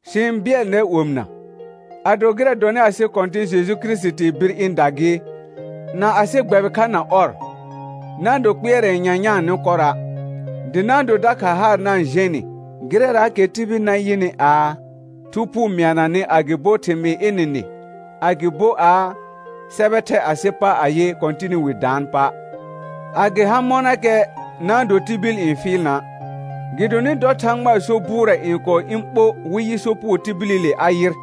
Sɩ-n bɩɛl nɛr omɩna, ado gɩrɛ dɔnɩ asɩ Kɔ̃tɩ̃ Jeju Kirisitii bir ɩ̃da gɩ, na asɩ gbɛbɩ kha na ɔr, na-n do kpɩɛrɛ nyanyãa nɩ kɔrɔa', dɩ na-n do dakha haar na-n jɛ̃ nɩ gɩrɛraakɛ tibil na yɩnɩ aa, Thu Phuu mɩana nɩ agɩbo thɩmɩɩr ɩnɩ nɩ agɩbo aa, sɛbɛ thɛ asɩ pa ayɩ, Kɔ̃tɩnɩ wi daan pa'. A gɩ ha mɔnakɛ na-n do tibil n fɩɩl na', gɩdonɩ dɔ Thãgba so bʋʋrɛ n kɔɔ ɩ̃ ɓo wɩ yɩ Sopugo tibilile a yɩr,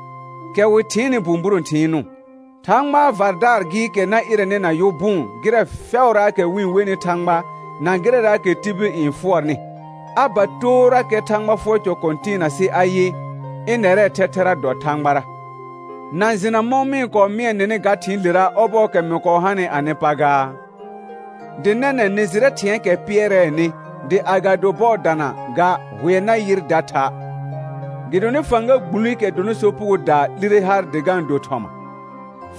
kɛ wɩ thɩɩnnɩ bũburõ thɩɩnʋʋ, Thãgbaa vardaar gɩɩkɛ na ɩrɛnɩ na yʋ bʋʋn gɩrɛ fɛʋraakɛ wɩ-n wenɩ Thãgba na gɩrɛraakɛ tibil n fʋɔrnɩ, a ba toorakɛ Thãgba fʋɔr cɔ kɔ̃tɩɩna sɩ ayɩ, ɩnɛrɛɛ thɛthɛra dɔ Thãgbara. Na jɩna mɔ̃ mɩ-n kɔɔ mɩɛ nɩnɩ ga thɩ̃ɩlera ɔbɔɔkɛ mɩ kɔɔ hanɩ anɩ pa gaa? Dɩ nɛnɛ̃ nɩ jɩrɛ thɩ̃ɛɛkɛ pɩɛrɛɛnɩ dɩ agado bɔɔ dana ga hʋɛ na yɩr da tha'. Gɩdonɩ fãga gbulikɛ dɔnɩ sopugodaa 'lire har dɩ ga-n do thɔma,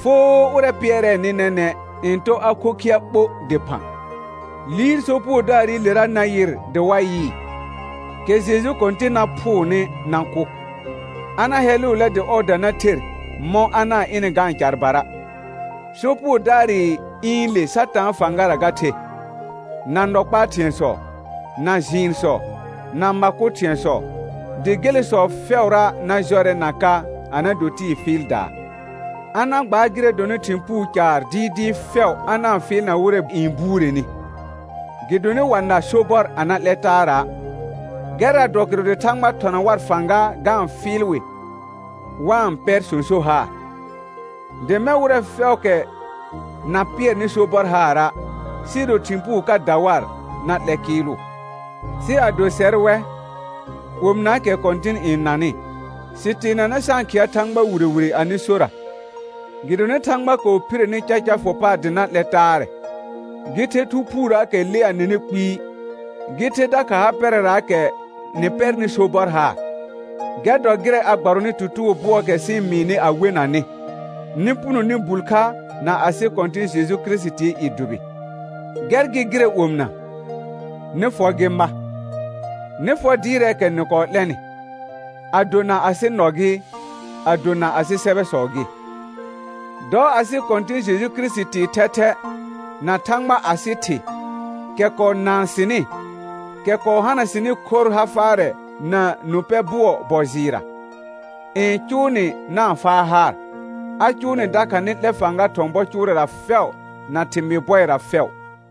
foo ʋrɛ pɩɛrɛɛnɩ nɛnɛ̃ n tɔ a khokhɩa ɓo dɩphã. Liir Sopugodaarɩlera na yɩr dɩ wa yɩɩ, kɛ Jeju Kɔ̃tɩn na phʋʋnɩ na kʋ, a na hɛlʋʋlɛ dɩ ɔɔda na ther mɔ̃ a na-n ɩnɩ ga-n carbara. Sopugodaarɩ ɩ̃ɩle Satãa fãgara ga the, na nɔ kpaa thɩ̃ɛsɔ, na jɩɩnsɔ, na ma kʋ thɩ̃ɛsɔ, dɩ gelesɔ fɛʋra na jɔrɛ na ka a na do tɩɩ fɩɩldaa. A na gbaar gɩrɛ dɔnɩ thɩ̃ puu caar dɩɩdɩɩ fɛʋ a na-n fɩɩlna wɩrɛ n buureni, gɩdonɩ wa na sobɔr a na 'lɛ taara'. Gɛrra dɔ kɩrʋ dɩ Thãgba thɔna war fãga ga-n fɩɩl wɩ wa-n pɛr sõsor haar. Dɩ mɛ̃ wɩrɛ fɛʋʋkɛ na pɩɛrnɩ sobɔr haara', sɩɩ do thɩ̃ puu ka da war, na 'lɛ kɩɩlʋ. Sɩ ado sɛr wɛ, omɩnaakɛ Kɔ̃tɩn n nanɩ, sɩ teenanɛ sa-n khɩa Thãgba wire wire anɩ sora, gɩdonɩ Thãgba kɔɔ phire ni caca fʋ paar dɩ na 'lɛ taarɛ, gɩ the Thu Phuurəəkɛ lea nɩnɩ kpɩɩ, gɩ the dakha ha pɛrɛraakɛ nɩ pɛrnɩ sobɔr haar. Gɛr dɔ gɩrɛ a gbarɔnɩ tutugo bʋɔɔkɛ sɩ-n mɩɩnɩ a wena nɩ, nɩ puno nɩ bul kha na asɩ Kɔ̃tɩ̃ Jeju Kirisitii i dʋbɩ. Gɛr gɩ gɩrɛ omɩna, nɩ fɔ gɩ ma, nɩ fɔ dɩɩrɛɛkɛ nɩ kɔɔ 'lɛnɩ, ado na asɩ nɔ gɩ, ado na asɩ sɛbɛsɔ gɩ. Dɔ asɩ Kɔ̃tɩ̃ Jeju Kirisitii thɛthɛ, na Thãgba asɩ Thɩ, kɛ kɔɔ naan sɩnɩ, kɛ kɔɔ hana sɩnɩ khorr ha faarɛ na nũ pɛ bʋɔ bɔ jɩɩrra, n cʋʋ nɩ na-n faa haar, a cʋʋ nɩ dakha nɩ 'lɛ fãga thɔ̃ bɔ cʋʋrɛra fɛʋ na thɩmɩɩ bɔɩra fɛʋ.